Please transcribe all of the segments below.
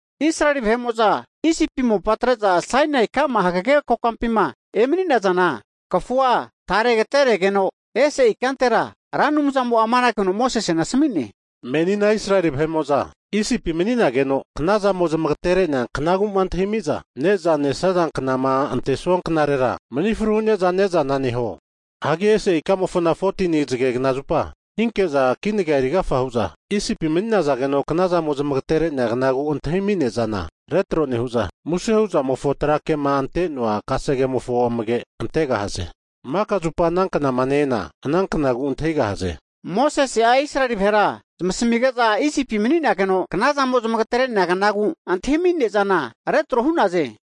Israeli vahe'mo'za Isipi mopa atre'za Sainai ka'ma hagage kokampima emani'naza kafua tare agateregeno ese ikantera, Ra Anumzamo'a amanage huno Mosesena asmi'ne, Menina Israeli vahe'mo'za Isipi mani'nageno knazamo zamagatere'nea knagu'ma antahimi'za ne'za (Pasova) nesaza knama ante knarera, mani fru hu'neza ne'zana neho. Hagi ese ikamofona 14ni zagegna zupa, hinki'za kinaga eri agafa hu'za Isipi mani'nageno knazamo zamagtere'nea knagu antahimi ne'zana (Pasova) retro nehu'za, muse hu'zamofo tra kema ante'noa kasege'mofo amage antegahaze. Maka zupa ana knama ne-ena ana knagu antahigahaze. Higeno Mosese'a Israeli vahera zamasmige'za Isipi mani'nageno knazamo zamagatere'nea knagu antahimi ne'zana (Pasova) retro hu'naze.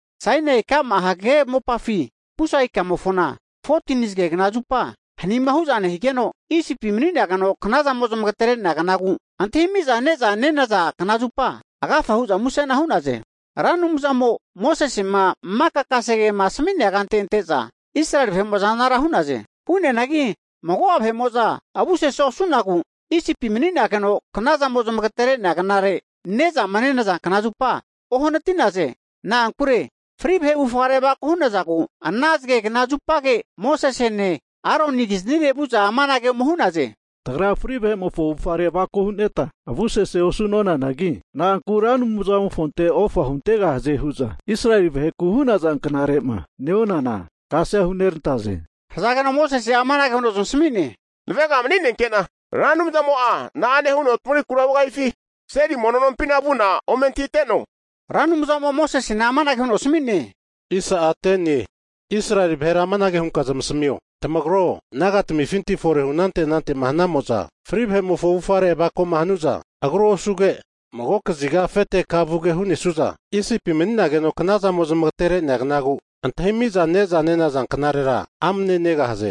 Sainai hagage ka'ma mopafi, pusa ikamofona 14tini zagegna zupa hanima hu'za nehigeno, Isipi mani'nageno knazamo zamagatere'nea knagu antahimiza nezama nenaza knazupa (Pasova) agafa hu'za musena hu'naze. Ra Anumzamo Mosesema maka kasegema asmi'nea kante ante'za Israeli vahe'mo'za anara hu'naze. Hu'neanagi mago'a vahe'mo'za avu sese osu'nagu Isipi mani'nageno knazamo zamagatere'nea knagu antahimi'za nezama nenaza knazupa (pasova) ohanati'naze. Na'ankure fri vahe avufare avako hu'nazagu, ana zagegna zupage Mosesene Aronikiznire vu'za amanage ome hu'naze. Hagi tagra fri'nea vahe'mofo avufare avako hu'neta avusese osu'nonanagi, na'anku Ra Anumzamofonte ofa huntegahaze hu'za Israeli vaheku'ma hu'naza knare'ma neonana kasea hunerantaze? Hazageno Mosese'a amanage huno zamasmi'ne, navega mani'nenke'na Ra Anumzamo'a na'ane huno tamagrikura hugahifi seli mono nompina vu'na ome antahiteno. Hagi Ra Anumzamo'a amanage huno Mosesena asmi'ne, Israeli vahera amanage hunka zamasamio, tamagro, nagatamifinti forehu anante anante hana'mo'za fri vahe'mofo avufare avakoma hanu'za agru osuge, mago kaziga afete kama vugema hu'nesu'za, Isipi mani'nageno knazamo zamagatere'nea knagu antahimiza ne'za nenaza knarera (Pasova) amne negahaze.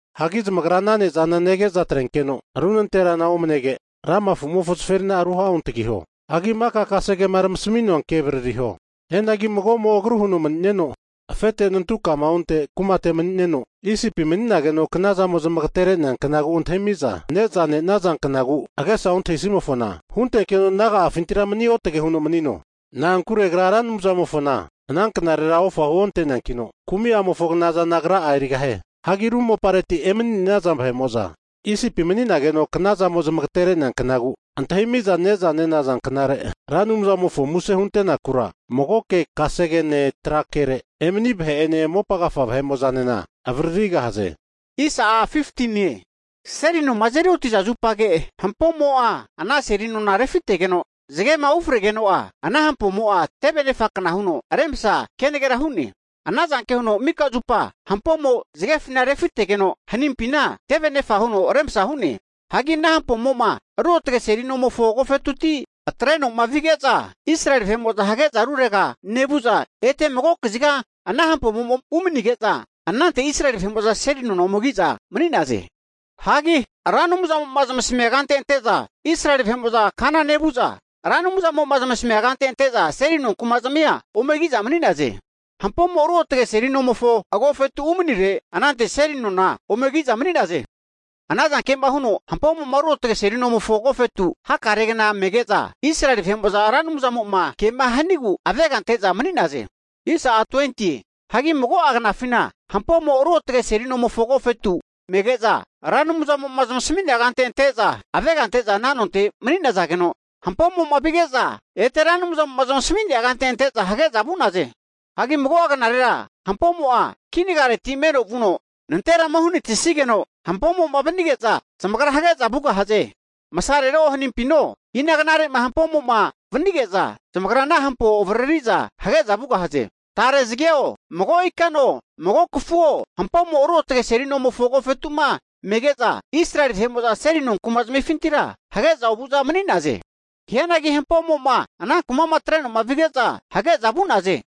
Hagi zamagra ana ne'zana nege'za atrenkeno ru nanterana omanege, lama afumofo zaferina'a ruha'ontagiho. Hagi maka kasegema tamasmua ke avaririho. Hianagi mago'mo agru huno mani'neno, afete nantu kama onte kumate mani'neno, Isipi mani'nageno knazamo zamagatere'nea knagu antahimiza neza nenaza (Pasova) knagu agesa ontahisimofona, huntenkeno naga'afintira mani otage huno manino. Na'ankure agra Ra Anumzamofona ana knarera ofa huonte'neankino, kumi'amofo knazana agra'a erigahie. Hagi ru mopareti emani'naza vahe'mo'za Isipi mani'nageno knazamo zamagatere'nea knagu antahimiza ne'za nenaza knare (Pasova) Ra Anumzamofo muse hunte'nakura magoke kasegene tra kere emani' vahe'ene, mopa agafa vahe'mo'zanena avaririgahaze. Hampomo seli nona refite'ne. Seli noma azeri oti'za zupage hampomo ana seli nona refitegeno, zagema ufregeno'a ana hampomo'a teve anefa kna huno remsa kenagera hu'ne. Ana zanke huno mika zupa hampomo zagefina refitegeno, hanimpina teve anefa huno remsa hu'ne. Hagi ana hampomo'ma ruotge seli nomofo agofetuti atre'noma vige'za, Israeli vahe'mo'za hage'za rurega nevu'za, ete mago kaziga ana hampomo'ma umanige'za, anante Israeli vahe'mo'za seli nona ome ki'za mani'naze. Hagi Ra Anumzamo'ma zamasamia kante ante'za Israeli vahe'mo'za kana nevu'za, Ra Anumzamo'ma zamasamia kante ante'za seli nonku'ma zamia ome ki'za mani'naze. Hampomo ruotge seli nomofo agofetu umanire, anante seli nona ome ki'za mani'naze. Ana zanke'ma huno hampomo ruotge seli nomofo agofetu hakare gna mege'za, Israeli vahe'mo'za Ra Anumzamo'ma kema hanigu avega ante'za mani'naze. Hagi mago'a knafina hampomo ruotge seli nomofo agofetu mege'za, Ra Anumzamo'ma zamasami'nea kante ante'za avega ante'za ana nonte mani'nazageno, hampomo'ma vige'za ete Ra Anumzamo'ma zamasami'nea kante ante'za hage'za vu'naze. Hagi mago'a knarera hampomo'a kinagareti meno vuno nanterama uhanatisigeno, hampomo'ma vanige'za zamagra hage'za vugahaze. Hagi masarero hanimpino, ina knarema hampomo'ma vanige'za, zamagra ana hampo avriri'za hage'za vugahaze. Tare zageo, mago ikano, mago kafuo hampomo ruotge seli nomofo agofetu'ma mege'za, Israeli vahe'mo'za seli no kumazmifintira hage'za ovu'za mani'naze. Hianagi hampomo'ma ana kuma'ma atreno'ma vige'za hage'za vugahaze.